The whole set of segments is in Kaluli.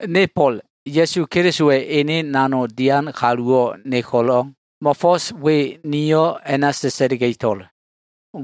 Ne Fo꞉l, Ya꞉su Kelisowa꞉ ene nanogdo꞉ dian kalu nowo꞉ ne ko꞉lo꞉, mo꞉fo꞉s we ni sa꞉sa꞉liga꞉to꞉l.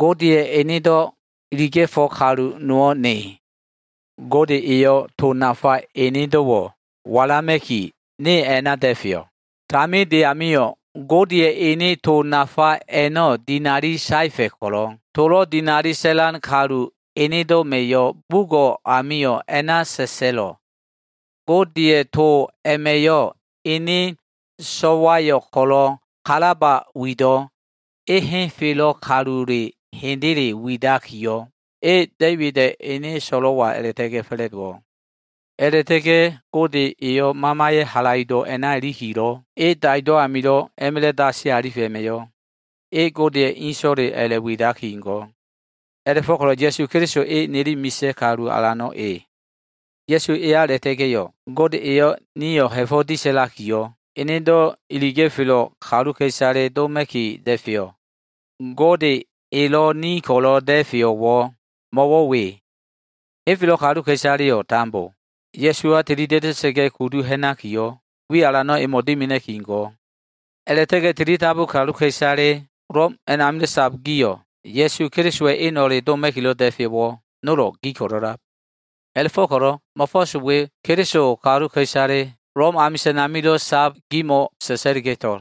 Godeya꞉ enedo꞉ iliga꞉felo꞉ kalu nowo꞉ ne. Gode eyo꞉ to nafa enedo꞉wo꞉ walama꞉ki ne a꞉na da꞉feyo꞉. Taminde amio꞉ Godeya꞉ ene to nafa a꞉no꞉ dinali saefa꞉ ko꞉lo꞉, tolo꞉ dinali sa꞉lan kalu enedo꞉ma꞉yo꞉ bugo꞉ amio꞉ a꞉na sa꞉sa꞉lo꞉. Godeya꞉ to a꞉ma꞉yo꞉, ene so꞉wayo꞉ ko꞉lo꞉ kalaba wido꞉. E henfelo꞉ kalule hendele a꞉la꞉widakiyo꞉, e Da꞉ibida꞉ ene so꞉lo꞉wa a꞉la꞉ta꞉ga꞉ fa꞉la꞉dowo꞉. A꞉la꞉ta꞉ga꞉ Gode eyo꞉ Mamaya꞉ halaido꞉ a꞉na ilikilo꞉, e daido꞉ amilo꞉ a꞉ma꞉la꞉ dasi alifa꞉ a꞉ma꞉yo꞉, e Godeya꞉ So꞉wale a꞉la꞉widaki go꞉. A꞉la꞉fo꞉ko꞉lo꞉, Ya꞉su Keliso e nili misa꞉ Kalu Alano꞉ e. Ya꞉su eya a꞉la꞉ta꞉ga꞉yo꞉, Gode eyo꞉ nio꞉ ha꞉fo꞉ disa꞉lakiyo꞉, enedo꞉ iliga꞉felo꞉ kaluka꞉isale doma꞉ki da꞉feyo꞉. Gode elo꞉ ni ko꞉lo꞉ da꞉feyo꞉wo꞉ mo꞉wo꞉ we. Henfelo꞉ kaluka꞉isaleyo꞉ tambo Ya꞉suwa tilida꞉da꞉sa꞉ga꞉ kudu ha꞉nakiyo꞉, wi alano꞉ emo꞉ dimina꞉ki go꞉. A꞉la꞉ta꞉ga꞉ tilidabu kaluka꞉isale Lom a꞉namilo꞉ sab gio꞉, Ya꞉su Kelisowa꞉ eno꞉le doma꞉kilo꞉ da꞉feyo꞉wo꞉ nolo꞉ gi ko꞉lo꞉lab. A꞉la꞉fo꞉ko꞉lo꞉ mo꞉fo꞉s we Keliso kaluka꞉isale, Lom amisa꞉n amilo꞉ sab gimo꞉ sa꞉sa꞉liga꞉to꞉l.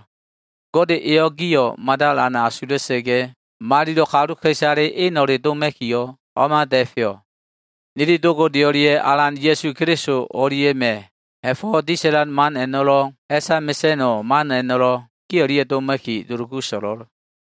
Gode eyo꞉ gio꞉ mada alan asula꞉sa꞉ga꞉, malilo꞉ kaluka꞉isale eno꞉le doma꞉kiyo꞉, o꞉ma da꞉feyo꞉. Nili Do Gode o꞉lia꞉ Alan Ya꞉su Keliso o꞉lia꞉ma꞉ ha꞉fo꞉ disa꞉lan man a꞉no꞉lo꞉, ha꞉sa mesa꞉no꞉ man a꞉no꞉lo꞉ gi o꞉lia꞉ doma꞉ki dulugu so꞉lo꞉l.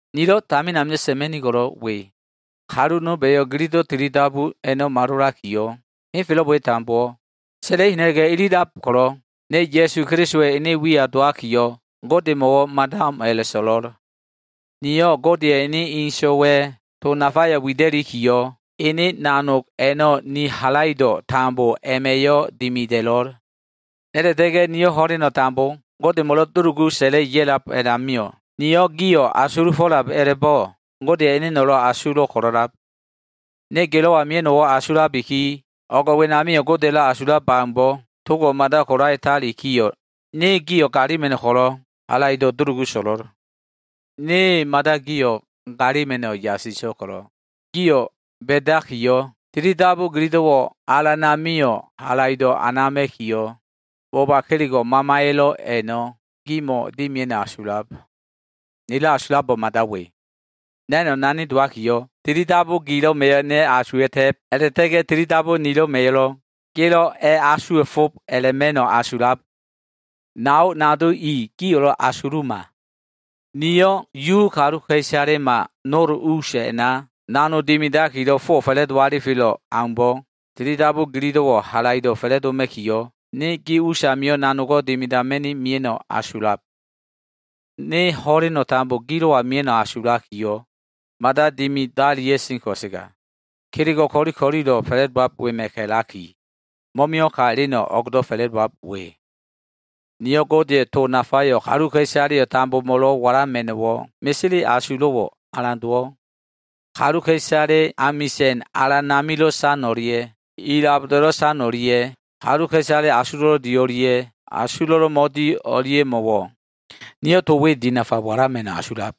Nilo꞉ tamin amilo꞉ sa꞉ma꞉nigo꞉lo꞉ we. Kalu nolba꞉yo꞉ tilidabu gililo꞉ a꞉no꞉ malolakiyo꞉, henfelo꞉ we tambowo꞉ sa꞉la꞉i ha꞉na꞉ga꞉ ilililab ko꞉lo꞉, ne Ya꞉su Kelisowa꞉ ene wiya dowakiyo꞉, Godemo꞉wo꞉ mada o꞉m a꞉la꞉so꞉lo꞉l. Niyo꞉ Godeya꞉ ene So꞉waya꞉ to nafayo꞉ wida꞉likiyo꞉, halaido꞉ nilo꞉wo꞉ tambo ene nanog a꞉na dowaki dimida꞉lo꞉l. A꞉la꞉ta꞉ga꞉ niyo꞉ ho꞉leno꞉ tambo Godemo꞉lo꞉ dulugu sa꞉la꞉li ya꞉lab a꞉namio꞉, niyo꞉ gio꞉ asulufo꞉lab a꞉la꞉bo꞉, Godeya꞉ eneno꞉lo꞉ asulo꞉ ko꞉lo꞉lab. Ne gilo꞉wa mia꞉no꞉wo꞉ asulabiki, o꞉g wenamio꞉ Godeya꞉lo꞉ asulab aumbo꞉, togo꞉ mada kolalitalikiyo꞉, ne gio꞉ ko꞉lo꞉, halaido꞉ dulugu so꞉lo꞉l. Ne mada gio꞉ galima꞉no꞉ yasiso꞉l ko꞉lo꞉, gio꞉ ba꞉dakiyo꞉, tilidabu gililo꞉wo꞉ Alan amio꞉ halaido꞉ anama꞉kiyo꞉, boba kelego꞉ Mamaya꞉lo꞉ a꞉no꞉ gimo꞉ dimia꞉no꞉ asulab. Nilo꞉ asulo꞉lo꞉ mada we. Na꞉no꞉ nani dowakiyo꞉, tilidabu gilo꞉ma꞉yo꞉ ne asuwa꞉ta꞉b a꞉la꞉ta꞉ga꞉ tilidabu nilo꞉ma꞉yo꞉lo꞉ gelo꞉ a꞉asuwa꞉fo꞉b a꞉la꞉ma꞉no꞉ asulab. Nao nado i, gio꞉lo꞉ asuluma. Niyo꞉ Yu kaluka꞉isalema nol us a꞉na nanog dimidakilo꞉ fowo꞉ fa꞉la꞉do alifelo꞉ aumbo꞉, tilidabu gililo꞉wo꞉ halaido꞉ fa꞉la꞉doma꞉kiyo꞉, ne gi us amio꞉ nanogo꞉ dimidama꞉ni mia꞉no꞉ asulab. Ne ho꞉leno꞉ tambo gilo꞉wa mia꞉no꞉ asulakiyo꞉ mada dimadalia꞉sen ko꞉sega, kelego꞉ ko꞉li ko꞉lilo꞉ fa꞉la꞉dowab wema꞉ ka꞉laki, mo꞉mio꞉ ka eleno꞉ o꞉gdo꞉ fa꞉la꞉dowab we. Niyo꞉ Godeya꞉ to nafayo꞉ kaluka꞉isaleyo꞉ tambomo꞉lo꞉ walama꞉no꞉wo꞉ mesele asulo꞉wo꞉ alan dowo꞉. Kaluka꞉isale amisa꞉n alan amilo꞉ san o꞉lia꞉, ilaboda꞉lo꞉ san o꞉lia꞉, kaluka꞉isale asulo꞉lo꞉ di o꞉lia꞉, asulo꞉lo꞉ mo꞉di o꞉lia꞉mo꞉wo꞉ niyo꞉ to we dinafa walama꞉no꞉ asulab.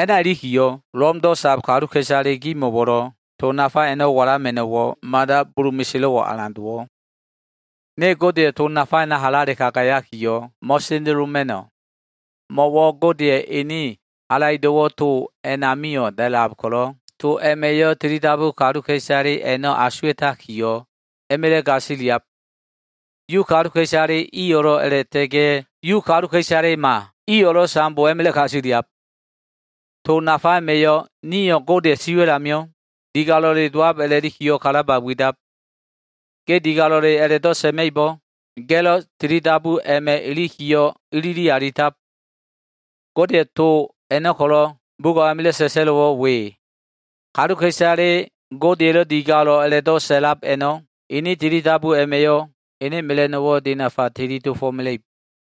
A꞉na ilikiyo꞉, Lomdo꞉ sab kaluka꞉isale gimo꞉wo꞉lo꞉ to nafa a꞉no꞉ walama꞉no꞉wo꞉ mada bulu meselo꞉wo꞉ alan dowo꞉. Ne Godeya꞉ to nafa a꞉na halale kagayakiyo꞉ mo꞉sendeloma꞉no꞉. Mo꞉wo꞉ Godeya꞉ ene halaido꞉wo꞉ to a꞉namio꞉ da꞉lab ko꞉lo꞉, to a꞉ma꞉yo꞉ tilidabu kaluka꞉isale a꞉no꞉ asuwa꞉takiyo꞉, a꞉ma꞉la꞉ gasiliab. Yu kaluka꞉isale iyo꞉lo꞉ a꞉la꞉ta꞉ga꞉ Yu kaluka꞉isalema iyo꞉lo꞉ tambo a꞉ma꞉la꞉ gasiliab. To nafa a꞉ma꞉yo꞉ nio꞉ Godeya꞉ siwa꞉l amio꞉ digalo꞉le dowab a꞉la꞉likiyo꞉ kalaba widab. Ge digalo꞉le a꞉la꞉do꞉ sa꞉ma꞉ibo꞉, ga꞉lo꞉ tilidabu a꞉ma꞉ ilikiyo꞉ ilili alitab. Godeya꞉ to a꞉no꞉ ko꞉lo꞉ bugo꞉ amilo꞉ sa꞉sa꞉lo꞉wo꞉ we. Kaluka꞉isale Godeya꞉lo꞉ digalo꞉ a꞉la꞉do꞉ sa꞉lab a꞉no꞉, ene tilidabu a꞉ma꞉yo꞉ ene mela꞉no꞉wo꞉ dinafa tili dofo꞉mela꞉ib.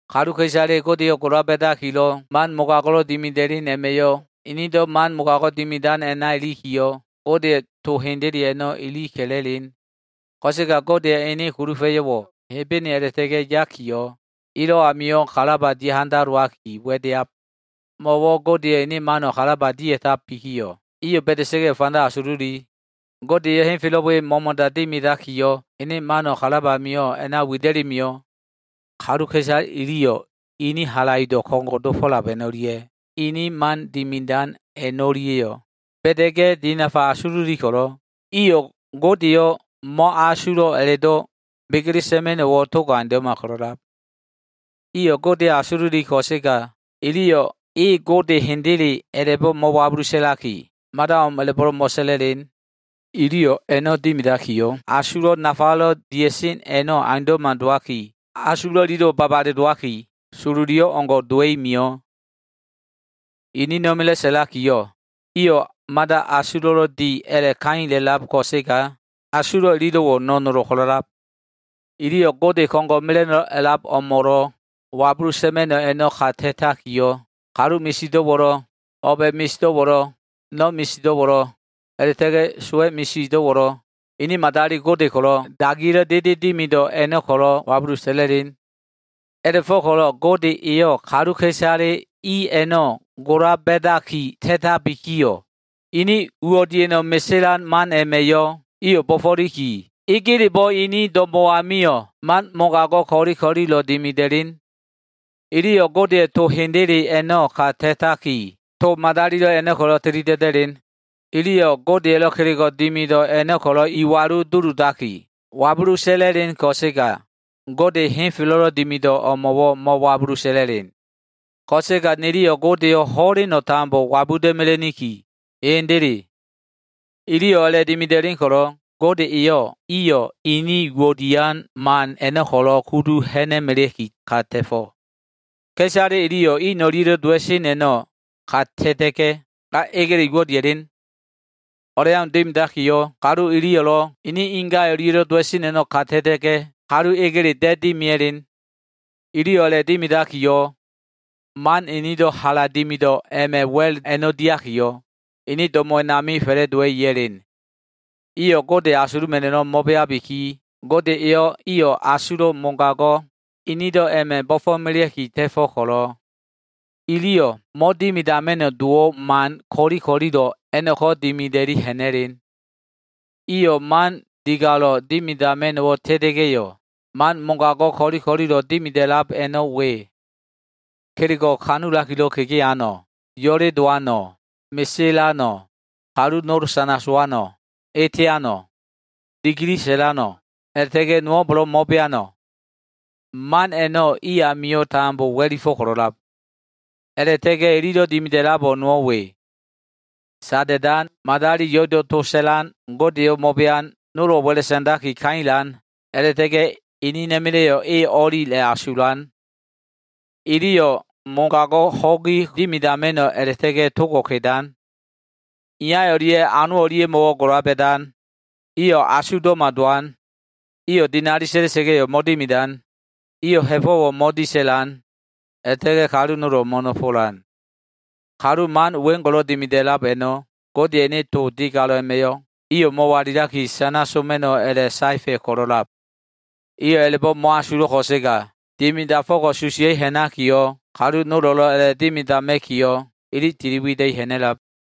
Kaluka꞉isale Godeyo꞉ gola ba꞉dakilo꞉ man mogago꞉lo꞉ dimida꞉len a꞉ma꞉yo꞉, inido꞉ man mogago꞉ dimidan a꞉na ilikiyo꞉, Godeya꞉ to hendele a꞉no꞉ ili ka꞉la꞉len. Ko꞉sega Godeya꞉ ene kulufa꞉yo꞉wo꞉ Hebene a꞉la꞉ta꞉ga꞉ yakiyo꞉, ilo꞉ amio꞉ kalaba dia꞉ handalowaki wa꞉deab. Mo꞉wo꞉ Godeya꞉ ene mano꞉ kalaba dia꞉tabikiyo꞉, iyo꞉ ba꞉da꞉sa꞉ga꞉yo꞉ fanda asululi. Gode eyo꞉ henfelo꞉ we mo꞉mo꞉da dimidakiyo꞉, ene mano꞉ kalab amio꞉ a꞉na wida꞉li mio꞉. Kaluka꞉isale iliyo꞉ ene halaido꞉wo꞉ ko꞉ngo꞉ dofo꞉lab a꞉no꞉lia꞉, ene man dimidan a꞉no꞉lia꞉yo꞉, ba꞉da꞉ga꞉ dinafa fanda asululi ko꞉lo꞉, iliyo꞉ Godeyo꞉ mo꞉asulo꞉ a꞉la꞉do꞉ sa꞉ma꞉no꞉wo꞉ togo꞉ aundo꞉ma ko꞉lo꞉lab. Iyo꞉ Godeyo꞉ asululi ko꞉sega, iliyo꞉ e Gode hendele a꞉la꞉bo꞉ mo꞉wabulu sa꞉laki, mada o꞉m a꞉la꞉bo꞉lo꞉ mo꞉sa꞉la꞉len. Iliyo꞉ a꞉no꞉ dimidakiyo꞉, asulo꞉ nafalo꞉ dia꞉sen a꞉no꞉ aundo꞉ma dowaki, asulo꞉ ililo꞉wo꞉ babale dowaki, sololi o꞉ngo꞉ dowa꞉i mio꞉. Inina꞉ma꞉la꞉ sa꞉lakiyo꞉ iyo꞉ mada asulo꞉lo꞉ di a꞉la꞉kaila꞉lab ko꞉sega, asulo꞉ ililo꞉wo꞉ no꞉nolo꞉ ko꞉lo꞉lab. Iliyo꞉ Gode ko꞉ngo꞉ mela꞉no꞉lo꞉ a꞉lab o꞉mo꞉lo꞉ wabulu sa꞉ma꞉no꞉ a꞉no꞉ ka ta꞉takiyo꞉, kalu misido꞉wo꞉lo꞉, o꞉ba꞉ misido꞉wo꞉lo꞉, no꞉ misido꞉wo꞉lo꞉, a꞉la꞉ta꞉ga꞉ sowa꞉ misido꞉wo꞉lo꞉, ini madali gode ko꞉lo꞉ dagiya꞉lo꞉ dede dimido꞉ a꞉no꞉ ko꞉lo꞉ wabulu sa꞉la꞉len. A꞉la꞉fo꞉ko꞉lo꞉ Gode eyo꞉ kaluka꞉isale i a꞉no꞉ gola ba꞉daki ta꞉tabikiyo꞉, inin uwo꞉ dia꞉no꞉ meselan man a꞉ma꞉yo꞉ iyo꞉ bo꞉fo꞉liki, egelebo꞉ ini do꞉mo꞉ amio꞉ man mogago꞉ ko꞉li ko꞉lilo꞉ dimida꞉len. Iliyo꞉ Godeya꞉ to hendele a꞉no꞉ ka ta꞉taki, to madalilo꞉ a꞉no꞉ ko꞉lo꞉ tili da꞉da꞉len. Iliyo꞉ Godeya꞉lo꞉ kelego꞉ dimido꞉ a꞉no꞉ ko꞉lo꞉ iwalu duludaki, wabulu sa꞉la꞉len ko꞉sega, Gode henfelo꞉lo꞉ dimido꞉ o꞉mo꞉wo꞉ mo꞉wabuda꞉len. Ko꞉sega niliyo꞉ Godeyo꞉ ho꞉leno꞉ tambo wabuda꞉ mela꞉niki. Hendele. Iliyo꞉ a꞉la꞉dimida꞉len ko꞉lo꞉, Gode eyo꞉ iyo꞉ inin uwo꞉ dian man a꞉no꞉ ko꞉lo꞉ kudu ha꞉na꞉melea꞉ki ka ta꞉fo꞉. Ka꞉isale iliyo꞉ in o꞉lia꞉lo꞉ dowa꞉sen a꞉no꞉ ka ta꞉ta꞉ga꞉, ga egele uwo꞉ dia꞉len. O꞉leau dimidakiyo꞉, kalu iliyo꞉lo꞉ ini inga o꞉lia꞉lo꞉ dowa꞉sen a꞉no꞉ ka ta꞉ta꞉ga꞉, kalu egele da꞉ dimia꞉len. Iliyo꞉ a꞉la꞉dimidakiyo꞉, man inido꞉ hala dimido꞉ a꞉ma꞉ wa꞉l a꞉no꞉ diakiyo꞉, ini do꞉mo꞉ a꞉nami fa꞉la꞉dowa꞉i ya꞉len. Iyo꞉ Gode asuluma꞉no꞉ a꞉no꞉ mo꞉beabiki, Gode eyo꞉ iyo꞉ asulo꞉ mogago꞉ inido꞉ a꞉ma꞉ bo꞉fo꞉melea꞉ki ta꞉fo꞉ ko꞉lo꞉, iliyo꞉ mo꞉dimidama꞉no꞉ dowo꞉ man ko꞉li ko꞉lilo꞉ a꞉no꞉ko꞉ dimida꞉li ha꞉na꞉len. Iyo꞉ man digalo꞉ dimidama꞉no꞉wo꞉ ta꞉ta꞉ga꞉yo꞉, man mogago꞉ ko꞉li ko꞉lilo꞉ dimida꞉lab a꞉no꞉ we. Kelego꞉ kanulakilo꞉ kegeano꞉, yo꞉le dowano꞉, meselano꞉, kalu nolo꞉ sana sowano꞉, eteano꞉, dikili sa꞉lano꞉, a꞉la꞉ta꞉ga꞉ nowo꞉mbo꞉lo꞉ mo꞉beano꞉. Man a꞉no꞉ tambo i amio꞉ wa꞉lifo꞉ ko꞉lo꞉lab. A꞉la꞉ta꞉ga꞉yo꞉, ililo꞉ dimida꞉labo꞉ nowo꞉ we. Sada꞉dan, madali yo꞉ido꞉ to sa꞉lan, Godeyo꞉ mo꞉bean, nolo꞉ wa꞉la sa꞉ndaki kailan, a꞉la꞉ta꞉ga꞉ inina꞉ma꞉la꞉yo꞉ e o꞉li a꞉la꞉asulan. Iliyo꞉ mogago꞉ ho꞉gi dimidama꞉no꞉ a꞉la꞉ta꞉ga꞉ togo꞉ kedan. Iya o꞉lia꞉ ano o꞉lia꞉mo꞉wo꞉ gola ba꞉dan. Iyo꞉ asugdo꞉ma dowan. Iyo꞉ dinali sa꞉la꞉sa꞉ga꞉yo꞉ mo꞉dimidan. Iyo꞉ ha꞉fo꞉wo꞉ mo꞉disa꞉lan. A꞉la꞉ta꞉ga꞉ kalu nolo꞉ mo꞉nofolan. Kalu man weo꞉ngo꞉lo꞉ dimida꞉lab a꞉no꞉, Godeya꞉ ene to digalo꞉ a꞉ma꞉yo꞉ iyo꞉ mo꞉walilaki, sana soma꞉no꞉ a꞉la꞉saefa꞉ ko꞉lo꞉ da꞉lab. Iyo꞉ a꞉la꞉bo꞉ asulo꞉ ko꞉sega, dimidafo꞉ko꞉ susiya꞉i ha꞉nakiyo꞉, kalu nolo꞉lo꞉ a꞉la꞉dimidama꞉kiyo꞉ ili tili wida꞉i ha꞉na꞉lab.